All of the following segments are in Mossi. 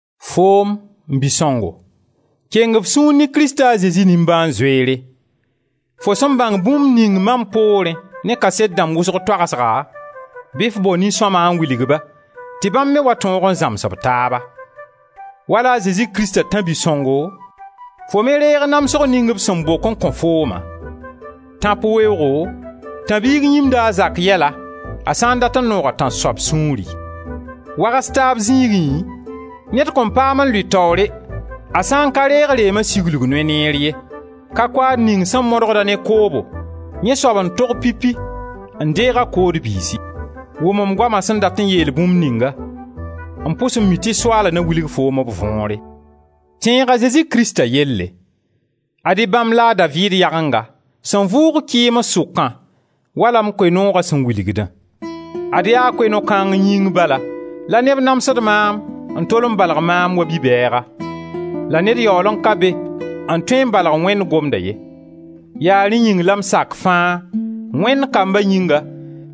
Foom, m bi-sõngo, keng f sũur ne Krista a Zezi nimbãan-zoeere: fo sẽn bãng bũmb ning mam poorẽ ne kaset dãmb wʋsg toagsga, bɩ f bao nin-sõma n wilg-ba, tɩ bãmb me wa tõog n zãms b taaba. Wala a Zezi Krista tãb-bi-sõngo, fo me reeg namsg ning b sẽn bok n kõ fooma. Tãp weoogo, tãb-biig yĩmda a zak yɛla, a sã n dat n noog a tãnsoab sũuri. Wags-taab zĩigẽ, ned kõn paam n lʋɩ taoore, a sã n ka reeg reema siglg noy neer ye. Ka-koaad ning sẽn modg-a ne koobo, yẽ soab n tog pipi n deeg a kood biisi. Wʋm m goama sẽn dat n yeel bũmb ninga. M pʋs n mi tɩ Soaala na wilg foom b võore. Tẽeg a Zezi Krista yelle; ad-y bãmb la a Daviid yagenga sẽn vʋʋg kɩɩms sʋkã wala m Koe-nooga sẽn wilgdã. Ad yaa Koe-noog kãng yĩng bala la neb namsd maam n tol n balg maam wa bi-bɛɛga. La ned yaool n ka be n tõe n balg Wẽnd gomda ye. Yaa rẽ yĩng la m sak fãa, Wẽnd kamba yĩnga,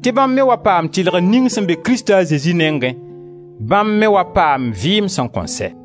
tɩ bãmb me wa paam tɩlgr ning sẽn be Krista a Zezi nengẽ, bãmb me wa paam vɩɩm sẽn kõn sɛ.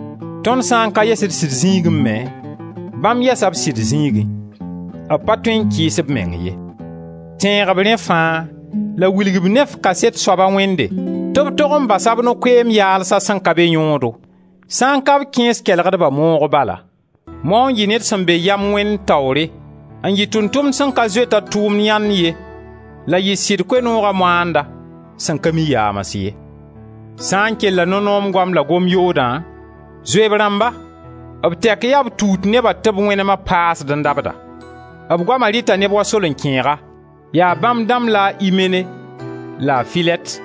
Tõnd sã n ka yɛs d sɩd zĩigẽ me, bãmb yɛsa b sɩd zĩigẽ: b pa tõe n kɩɩs b meng ye.» Tẽeg-b rẽ fãa la wilg-b ne f kaset soaba Wẽnde tɩ b tog n basa b no-koɛɛm yaalsã sẽn ka be yõodo, sã n ka b kẽes kelgdba moogo bala. Mao n yɩ ned sẽn be yam Wẽnd taoore, n yɩ tʋʋm-tʋmd sẽn ka zoet-a a tʋʋmda yãnd ye la yɩ sɩd Koe-nooga moanda sẽn ka mi yaams ye. Sã n kella no-noom goam la gom yoodã, zoe b rãmba. B tɛk yaa b tuut neba tɩ b wẽnema paasd n dabda. B goama rɩta neb wa solenkẽega. Yaa bãmb dãmb la a Imene la a Filɛt,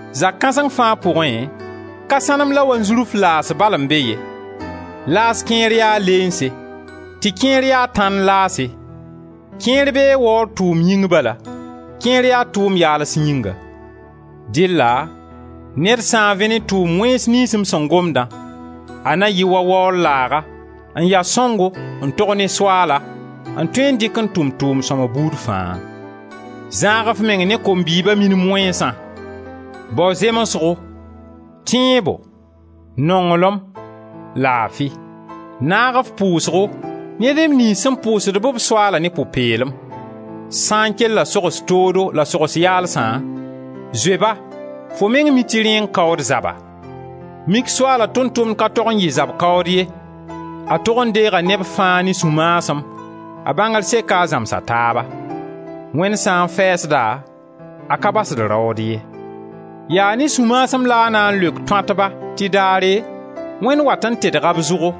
Zak kãseng fãa pʋgẽ, ka sãnem la wanzurf laas bal n be ye, laas kẽer yaa leense, tɩ kẽer ya tãnd laase, kẽer bee waoor tʋʋm yĩng bala, kẽer yaa tʋʋm-yaals yĩnga. Dɩlla ned sã n vẽ ne tʋʋm-wẽns niyns m sẽn gomdã, a na yɩ wa waoor laaga, n ya sõngo, n tog ne Soaala, n tõe n dɩk n tʋm tʋʋm-sõma buud fãa. Zãag f meng ne kom-bɩɩba minim wẽnsã; bao zemsgo, tẽebo, nonglem, laafi; naag f pʋʋsgo ne neb niyns sẽn pʋʋsd-b Soaala ne pʋ-peelem. Sã n kella sogs toodo la sogs yaalsã, zoe-ba, fo meng mi tɩ rẽ n kaood zaba. Mik Soaala tʋʋm-tʋmd ka tog n yɩ zab kaood ye, a tog n deega neb fãa ne sũ-maasem, a bãngr seka a zãms a taaba; Wẽnd sã n fɛɛsd-a, a ka basd raood ye. Yaa ne sũ-maasem la a na n leok tõatba tɩ daare Wẽnd wat n tedga b zʋgo,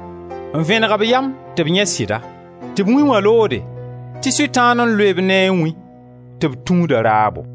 n vẽneg b yam tɩ b yãe sɩda, tɩ b wĩ wã loode, tɩ Sʋtãan n loe-b ne a wĩ, tɩ b tũud a raabo.